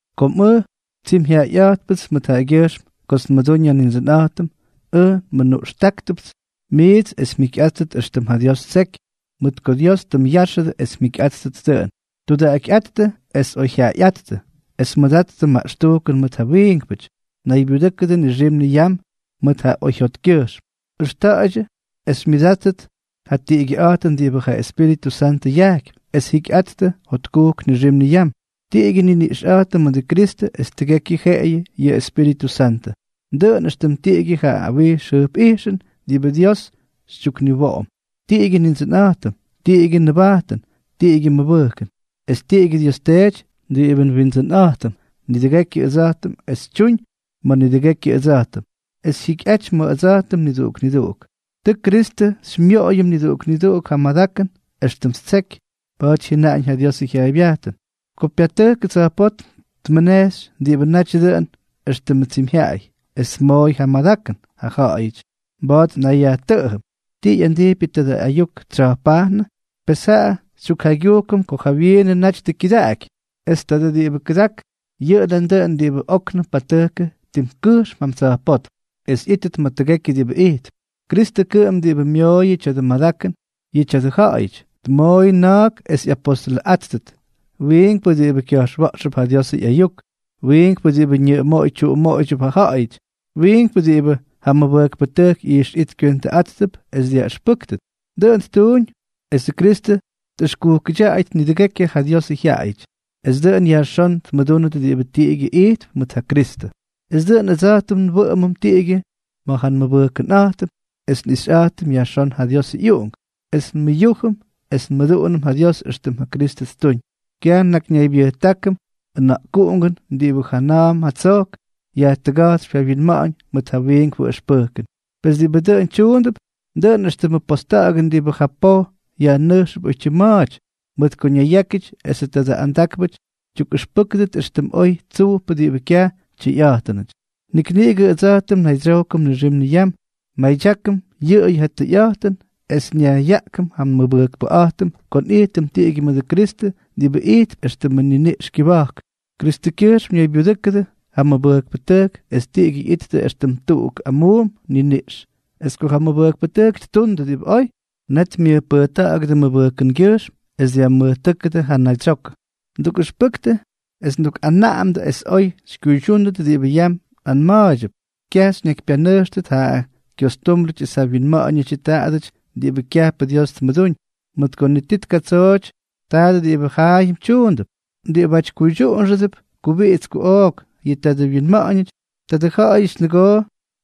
Kom ʉj tsimyjyaꞌayꞌa̱jtpʉts mʉt yʉꞌʉgyʉjxm kots nmʉdúñ ja Nindsʉnꞌa̱jtʉm, ʉj nmʉnuꞌxtáktʉpts miits es mjikyꞌáttʉt éxtʉm ja Dios ttseky, mʉt ko Dios tʉ myáxʉdʉ es mjikyꞌáttʉt dʉꞌʉn. Tudaꞌakyꞌáttʉ es oyjyaꞌayꞌáttʉ, es mʉdattʉ maꞌxtujkʉn mʉt ja wiinkpʉty. Naybyudʉ́kʉdʉ nixim niyam mʉt ja oyjyotkyʉjxm. Ʉxta̱ꞌa̱ydyʉ es xymyʉdáttʉt ja tiꞌigyʉꞌa̱jtʉn diꞌibʉ ja Espíritʉ Santʉ yajkypy, es jikyꞌattʉ jotkujk nixim niyam. Tiꞌigyʉ nniniꞌxꞌa̱jtʉm mʉdʉ Kristʉ es tiꞌigyʉ jeꞌeyʉ yʉ Espíritʉ Santʉ, dʉꞌʉn éxtʉm tiꞌigyʉ ja awijx jʉjpꞌijxʉn diꞌibʉ Dios xytyukniwoꞌom, tiꞌigyʉ Nindsʉnꞌa̱jtʉm, tiꞌigyʉ nʉbajtʉn, tiꞌigyʉ mʉbʉjkʉn, es tiꞌigyʉ Dios Teety diꞌibʉ nWindsʉnꞌa̱jtʉm nidʉgekyʉ ʉdsa̱jtʉm es tyuñ ma̱ nidʉgekyʉ ʉdsa̱jtʉm, es jyikyꞌaty ma̱ ʉdsa̱jtʉm niduꞌuk niduꞌuk. Tʉ Kristʉ xymyoꞌoyʉm niduꞌuk niduꞌuk ja madakʉn éxtʉm ttseky. Pa̱a̱ty jyʉnaꞌañ ja Diosʉ jyaaybyajtʉn: Ko pyatʉjkʉ tsa̱jpótm, tmʉnejxy diꞌibʉ naty dʉꞌʉn éxtʉmʉ tsyimyjyaꞌay, es tmooy ja madakʉn ja ja̱ꞌa̱yʉty. Mba̱a̱t nnayyajtʉꞌʉm: “¿Ti ꞌyandijpyʉ tadʉ ayuk tsya̱jpajnʉ?” Pes jaꞌa xytyukjaygyujkʉm ko jawyiinʉ naty tʉ kyʉdaꞌaky. Es tadʉ diꞌibʉ kʉdak, yʉꞌʉ nandʉꞌʉn diꞌibʉ óknʉm patʉjkʉ tim kʉjxm jam tsa̱jpótm es ꞌyítʉt ma̱ tʉgekyʉ diꞌibʉ ijtp. Kristʉ kʉꞌʉm diꞌibʉ myooyʉ tya̱dʉ madakʉn yʉ tya̱dʉ ja̱ꞌa̱yʉty, tmooy na̱a̱k es ꞌyapostolʉꞌáttʉt, wiinkpʉ diꞌibʉ kya̱jxwa̱ꞌxtʉp ja Diosʉ ꞌyayuk, wiinkpʉ diꞌibʉ ñʉꞌʉmooy tyuꞌumooydyʉp ja ja̱ꞌa̱yʉty, wiinkpʉ diꞌibʉ ja mʉbʉjkpʉtʉjk ꞌyijxꞌijt kywentʉꞌa̱jttʉp es dyaꞌʉxpʉktʉ. Dʉꞌʉn ttuuñ es Kristʉ tꞌʉxkujkʉdyaꞌayʉt nidʉgekyʉ ja Diosʉ jyaꞌayʉty, es dʉꞌʉn yajxón tmʉdúnʉt diꞌibʉ tiꞌigyʉ ijttʉp mʉt ja Kristʉ, es dʉꞌʉn ʉdsa̱jtʉm nwʉꞌʉmʉm tiꞌigyʉ ma̱ ja nmʉbʉjkʉnꞌa̱jtʉm es nꞌixyꞌa̱jtʉm yajxón ja Diosʉ ꞌyUꞌunk, es nmʉyújʉm es nmʉduꞌunʉm ja Dios éxtʉm ja Kristʉ ttuuñ. Kyaj nnakyñaybyʉjtákʉm ʉna̱ꞌkuꞌungʉn diꞌibʉ jana̱a̱m jatsojk yajtʉga̱jtsypy ja wyinma̱ꞌa̱ñ mʉt ja wiinkpʉ ʉxpʉjkʉn. Pes diꞌibʉ dʉꞌʉn tyuundʉp, dʉꞌʉn éxtʉmʉ posta̱ꞌa̱gʉn diꞌibʉ ja poj yajnʉjxʉp oytyim ma̱a̱ty, mʉt ko ñayyákyʉty esʉ tadʉ andákpʉty tyukꞌʉxpʉ́kʉdʉt éxtʉm oy tsujpʉ diꞌibʉ kyaj tyʉyꞌa̱jtʉnʉty. Nik niꞌigʉ ʉdsa̱jtʉm nnaydsyojkʉm nixim niyam, nmadyákʉm yʉꞌʉyʉ ja tʉyꞌa̱jtʉn es nyajꞌyaꞌkʉm ja nmʉbʉjkʉnꞌa̱jtʉm ko nꞌijtʉm tiꞌigyʉ mʉdʉ Kristʉ diꞌibʉ ijtp éxtʉm ja niniꞌxʉ kyʉba̱jk. Kristʉkyʉjxm ñaybyudʉ́kʉdʉ ja mʉbʉjkpʉtʉjk es tiꞌigyʉ ꞌyittʉ éxtʉm tuꞌuk amuum niniꞌx; es ko ja mʉbʉjkpʉtʉjk tyundʉ diꞌibʉ oy, net myʉjpʉjta̱ꞌa̱gʉdʉ mʉbʉjkʉngyʉjxm es dya̱jmʉjtʉ́kʉdʉ ja naydsyokʉ. Ndukꞌʉxpʉktʉ es ndukꞌanaꞌamdʉ es oy xykyuydyúndʉt diꞌibʉ yam nꞌanma̱a̱ydyʉp. Kyaj xyñakypyanʉjxtʉt ja kyostúmbrʉty es ja wyinma̱ꞌa̱ñʉdyʉ taadʉty diꞌibʉ kyajpʉ Dios tmʉdúñ, mʉt ko ni ti tkatsooty tadʉ diꞌibʉ jaayʉm tyuundʉp. Diꞌibáty kuydyuꞌunxʉdʉp kubiꞌits kuꞌook yʉ tadʉ winma̱ꞌa̱ñʉty, tadʉ ja̱ꞌa̱yʉty nʉgoo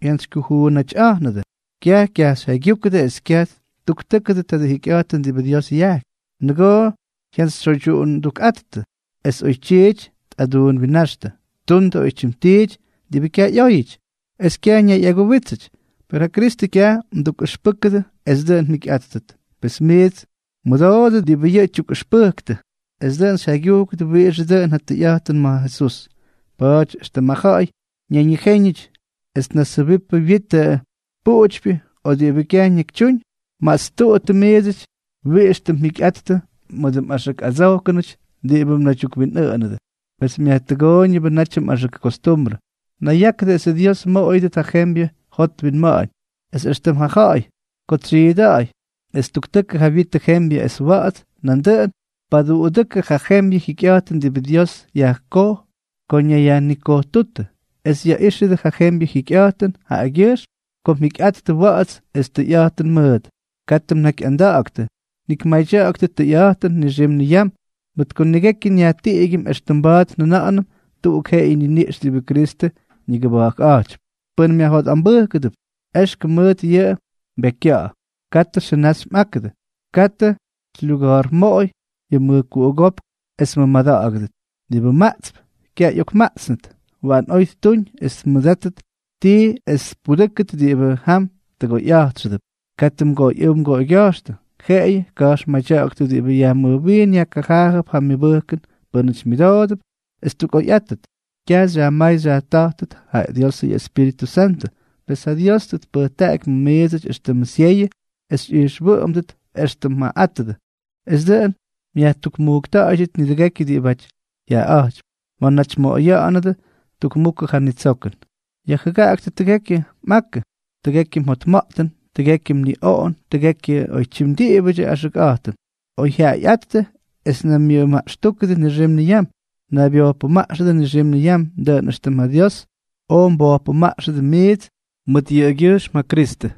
ꞌyokjantsykyujuunꞌátyꞌa̱jnʉdʉ, kyaj kyajxyjyaygyúkʉdʉ es kyaj ttuktʉ́kʉdʉ tadʉ jikyꞌa̱jtʉn diꞌibʉ Dios yajkypy, nʉgoo ꞌyokjantsytsyoydyuꞌundukꞌa̱jnʉdʉ es oytyiity tꞌaduunwinnáxtʉ, ttundʉ oytyim tiity diꞌibʉ kyaj ꞌyóyʉty, es kyaj ñayꞌaguwítsʉty. Per ja Kristʉ kyaj mdukꞌʉxpʉjkʉdʉ es dʉꞌʉn mjikyꞌáttʉt, pes miits mmʉdoodʉ diꞌibʉ yʉꞌʉ tyukꞌʉxpʉjk, es dʉꞌʉn xyjaygyujkʉdʉ wiꞌixʉ dʉꞌʉn ja tʉyꞌa̱jtʉn ma̱ Jesús. Pa̱a̱ty, éxtʉm ja ja̱ꞌa̱y ñayñijéñʉty es tnasjʉbipʉ wyitʉ puꞌutypyʉ o diꞌibʉ kyaj ñakytyúñ, mastuꞌuttʉ miidsʉty wiꞌix tʉ mjikyꞌattʉ mʉdʉ mꞌaxʉk adsojkʉnʉty diꞌibʉ mnaydyukwinꞌʉꞌʉnʉdʉ, pes myajtʉgooyʉnʉbʉ natyʉ mꞌaxʉk kostumbrʉ. Nayyákʉdʉ es ja Dios mmoꞌoyʉdʉt ja jembyʉ jot winma̱ꞌa̱ñ, es éxtʉm ja ja̱ꞌa̱y ko tsyiida̱ꞌa̱y es ttuktʉkʉ ja wyitʉ jembyʉ es wa̱ꞌa̱ts, nandʉꞌʉn paduꞌudʉ́kʉdʉ ja jembyʉ jikyꞌa̱jtʉn diꞌibʉ Dios yajkoj ko ñayyajnikojtútʉ, es yaꞌíxʉdʉ yʉ jembyʉ jikyꞌa̱jtʉn jaꞌagyʉjxm ko mjikyꞌattʉ wa̱ꞌa̱ts es tʉyꞌa̱jtʉn mʉʉt. Katʉ mnakyꞌanda̱ꞌa̱ktʉ, nik madya̱ꞌa̱ktʉ tʉyꞌa̱jtʉn nixim niyam, mʉt ko nidʉgekyʉ nyajtiꞌigyʉm, éxtʉm mba̱a̱t njʉna̱ꞌa̱nʉm tuꞌuk jeꞌeyʉ niniꞌx diꞌibʉ Kristʉ ñigʉba̱jkꞌa̱jtypy. Pʉn myajjotꞌambʉjkʉdʉp, éxkʉm mʉt yʉꞌʉ mbekykya̱ꞌa̱. Katʉ xʉnaxy mꞌákʉdʉ. Katʉ xylyuga̱a̱rmoꞌoy yʉ mʉjkuꞌugópk es mmʉmada̱ꞌa̱gʉdʉt. Diꞌibʉ maꞌtsp, kyaj ꞌyokmaꞌtsnʉt, waꞌan oy ttuñ es tmʉdátʉt tii es tpudʉ́kʉt diꞌibʉ jam tʉgoyꞌa̱jtxʉdʉp. Katʉ mgoꞌoyꞌʉ́w mgoꞌoygya̱jxtʉ, jeꞌeyʉ ka̱jxmadya̱ꞌa̱ktʉ diꞌibʉ yajmʉjwiin yajkajaajʉp ja myʉbʉjkʉn pʉ́nʉty myʉdoodʉp, es ttukꞌoyꞌátʉt. Kyaj xyajmáy xyajta̱jtʉt ja Diosʉ ꞌyEspíritʉ Santʉ, pes ja Dios tʉ tpʉjtaꞌaky ma̱ miidsʉty éxtʉmʉ syeyʉ es mꞌijxwʉꞌʉmʉdʉt éxtʉm mjaꞌaꞌátʉdʉ, es dʉꞌʉn myajtuꞌukmujkta̱ꞌa̱yʉdʉt nidʉgekyʉ diꞌibáty jyaꞌaꞌa̱jtypy ma̱ naty mmoꞌoya̱ꞌa̱nʉdʉ tukmukʉ ja nitsokʉn. Yajjʉgaꞌaktʉ tʉgekyʉ mꞌakʉ, tʉgekyʉ mjotma̱ꞌtʉn, tʉgekyʉ mniꞌoꞌon es tʉgekyʉ oytyim diꞌibʉdyʉ axʉkꞌa̱jtʉn. Oyjyaꞌayꞌáttʉ es naymyʉmaꞌxtúkʉdʉ nixim niyam. Naybyojkpʉmaꞌxʉdʉ nixim niyam, dʉꞌʉn éxtʉm ja Dios oj mbojpʉmaꞌxʉdʉ miits mʉt yʉꞌʉgyʉjxm ja Kristʉ.